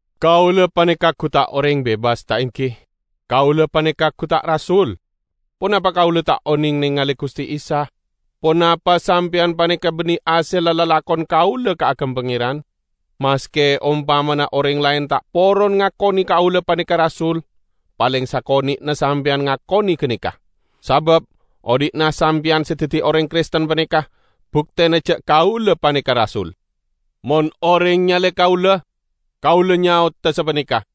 Kaula paneka gu ta' oreng bebas, ta' enggi? Kaula paneka gu ta' rasul? Ponapa kaula ta' oneng nengale Guste Isa? Ponapa sampeyan paneka banne hasella lalakon kaula kaagem Pangeran? Maske ompamana oreng laen ta' poron ngakone kaula paneka rasul, paleng sakone'na sampeyan ngakone ganeka! Sabab odhi'na sampeyan se daddi oreng Kristen paneka buktena ja' kaula paneka rasul. Mon oreng nyale kaula, kaula nyaoda sapaneka: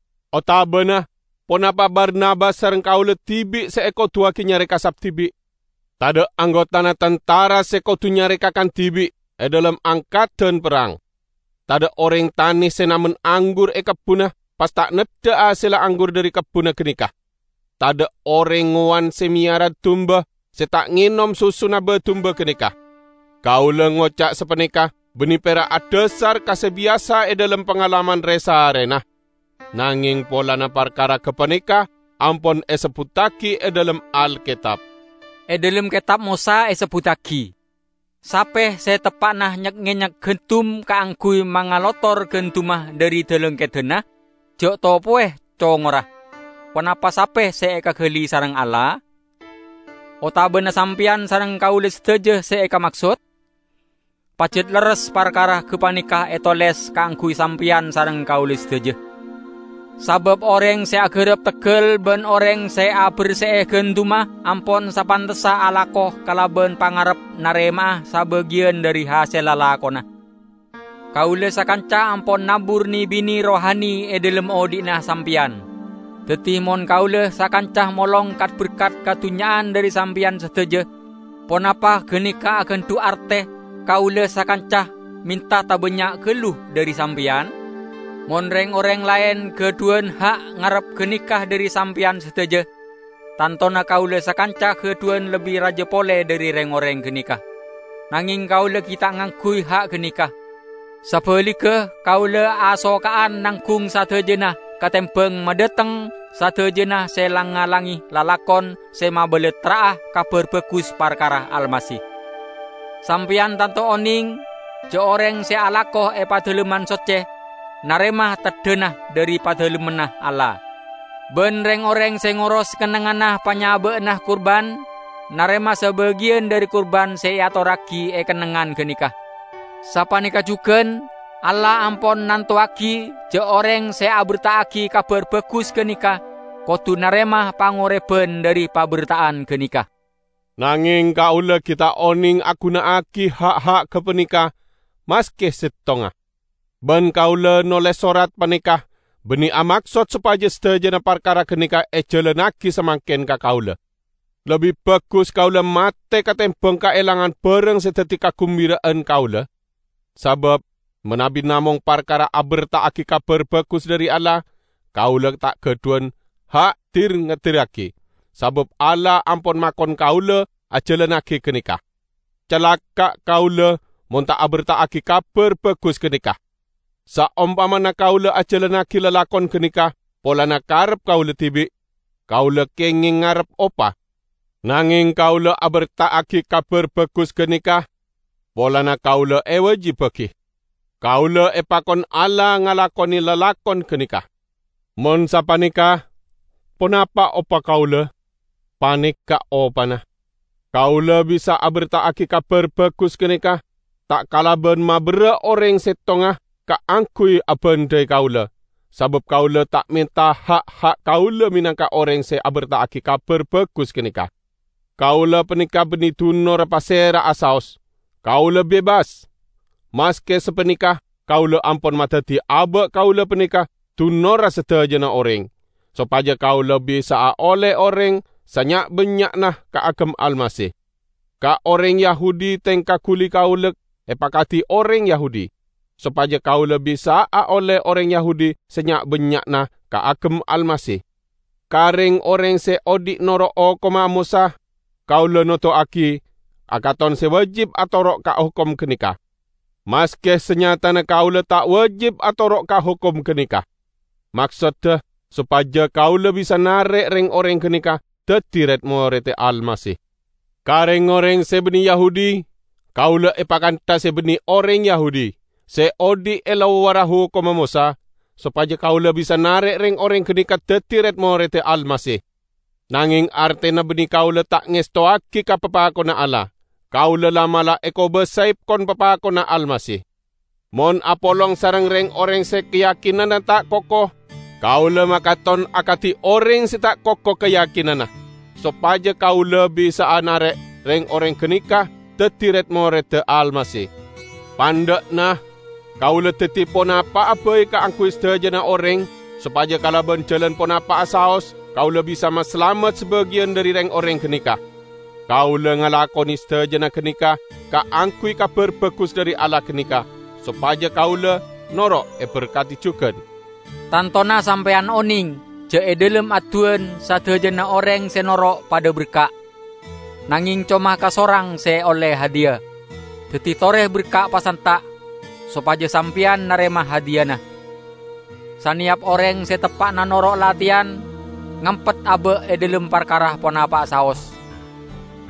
Otabana, ponapa Barnabas sareng kaula dibi' se ekoduwagi nyare kasap dibi'? Tadha' anggotana tantara se kodu nyare kakan dibi' e dhalem angkadan perrang! Tadha' oreng tana se namen anggur e kebbunna pas ta' neddha hasella anggur dhari kebbunna ganeka! Tadha' oreng ngowan se meyara dumba, se ta' ngenom susuna ba-dumbana ganeka! Kaula ngoca' sapaneka banne pera' adhasar ka se biyasa e dhalem pangalaman re-saarena, nangeng polana parkara gapaneka ampon esebbuttagi e dhalem Alketab. E dhalem Ketab Mosa esebbuttagi, "Sape se teppa'na nyek-ngenyek gandum kaangguy mangalotor gandumma dhari dalangkedanna, ja' topowe congorra." Ponapa sape se ekagali sareng Allah? Otabana sampeyan sareng kaula sadaja se ekamaksod? Pajat lerres parkara gapaneka etoles kaangguy sampeyan sareng kaula sadaja. Sabab oreng se agarap teggal ban oreng se aberse'e gandumma ampon sapantessa alako kalaban pangarep narema'a sabagiyan dhari hasella lakona. Kaula sakanca ampon nabur ne-bine rohani e dhalem odhi'na sampeyan. Daddi mon kaula sakanca molong kat-berkat kadunnya'an dhari sampeyan sadaja, ponapa ganeka agandhu' arte kaula sakanca menta tabannya' gallu dhari sampeyan? Mon reng-oreng laen gadhuwan ha' ngarep ganeka dhari sampeyan sadaja, tantona kaula sakanca gadhuwan lebbi raja pole dhari reng-oreng ganeka. Nangeng kaula gi' ta' ngangguy ha' ganeka. Sabaligga kaula asoka'an nanggung sadajana katembang madhateng sadajana se lang-ngalange lalakon se mabalattra'a Kabar Bagus parkara Almasih. Sampeyan tanto oneng ja' oreng se alako e Padalemman Socce narema teddhana dhari Padalemmanna Allah. Ban reng-oreng se ngoros kennengnganna panyaba'anna kurban, narema sabagiyan dhari kurban se eatorragi e kennengngan ganeka. Sapaneka jugan Allah ampon nantowagi ja' oreng se aberta'agi Kabar Bagus ganeka kodu narema pangoreban dhari paberta'an ganeka. Nangeng kaula gi' ta' oneng aguna'agi ha'-ha' gapaneka maske settonga. Ban kaula noles sorat paneka banne amaksod sopaja sadajana parkara ganeka ejalannagi samangken ka kaula. Lebbi bagus kaula mate katembang kaelangan barang se daddi kagumbira'an kaula. Sabab, manabi namong parkara aberta'agi Kabar Bagus dhari Allah, kaula ta' gadhuwan ha' dir-ngedirragi, sabab Allah ampon makon kaula ajalannagi ganeka. Calaka' kaula, mon ta aberta'agi Kabar Bagus ganeka! Saompamana kaula ajalannagi lalakon ganeka polana karep kaula dibi', kaula kengeng ngarep opa. Nangeng kaula aberta'agi Kabar Bagus ganeka polana kaula ewajibbagi. Kaula epakon Allah ngalakone lalakon ganeka. Mon sapaneka, ponapa opa kaula? Paneka' opana: Kaula bisa aberta'agi Kabar Bagus ganeka ta' kalaban maberra' oreng settonga kaangguy abandhai kaula, sabab kaula ta' menta ha'-ha' kaula menangka oreng se aberta'agi Kabar Bagus ganeka. Kaula paneka banne dunorra pasera'a saos; kaula bebas. Maske sapaneka kaula ampon madaddi aba' kaula paneka dunorra sadajana oreng, sopaja kaula bisa'a olle oreng sanya'-bannya'na kaagem Almasih. Ka oreng Yahudi tengka guli kaula epakadi oreng Yahudi, sopaja kaula bisa'a olle oreng Yahudi sanya'-bannya'na kaagem Almasih. Ka reng-oreng se odhi' noro' hokomma Mosa, kaula noduwagi akaton se wajib atoro' ka hokom ganeka, maske sanyatana kaula ta' wajib atoro' ka hokom ganeka. Maksodda sopaja kaula bisa narek reng-oreng ganeka daddi red-moredda Almasih. Ka reng-oreng se banne Yahudi, kaula epakantha se banne oreng Yahudi, se odhi' e lowarra hokomma Mosa, sopaja kaula bisa narek reng-oreng ganeka daddi red-moredda Almasih. Nangeng artena banne kaula ta' ngestowagi ka papakonna Allah; kaula la'-mala' ekobasae kon-papakonna Almasih. Mon apolong sareng reng-oreng se kayakinanna ta' koko, kaula makaton akadi oreng se ta' koko kayakinanna, sopaja kaula bisa'a narek reng-oreng ganeka daddi red-moredda Almasih. Pandha'na, kaula daddi ponapa'a bai kaangguy sadajana oreng sopaja kalaban jalan ponapa'a saos kaula bisa masalamet sabagiyan dhari reng-oreng ganeka. Kaula ngalakone sadajana ganeka kaangguy Kabar Bagus dhari Allah ganeka, sopaja kaula noro' eberkadi jugan. Tantona sampeyan oneng ja' e dhalem adduwan sadajana oreng se noro' padha berka', nangeng coma kasorang se olle hadiya. Daddi tore berka' pasanta' sopaja sampeyan narema hadiyana. Saneyap oreng se teppa'na noro' lateyan, ngampet aba' e dhalem parkara ponapa'a saos.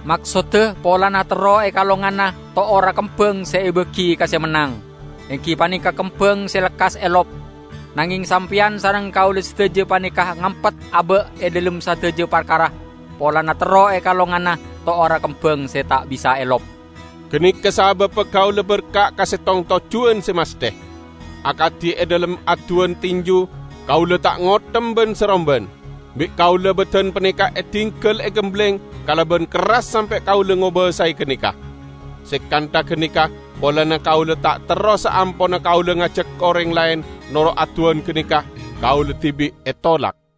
Maksodda polana terro ekalongana to'orra kembang se ebagi ka se mennang, enggi paneka kembang se lekkas elop. Nangeng sampeyan sareng kaula sadaja paneka ngampet aba' e dhalem sadaja parkara polana terro ekalongana to'orra kembang se ta' bisa elop. Ganeka sababba kaula berka' ka settong tojjuwan se masthe. Akadi e dhalem adduwan tinju, kaula ta' ngothem ban-saromban. Bi' kaula badan paneka edinggal egembleng kalaban kerras sampe' kaula ngobasae ganeka. Se kantha ganeka polana kaula ta' terro saamponna kaula ngajak oreng laen noro' adduwan ganeka, kaula dibi' etolak.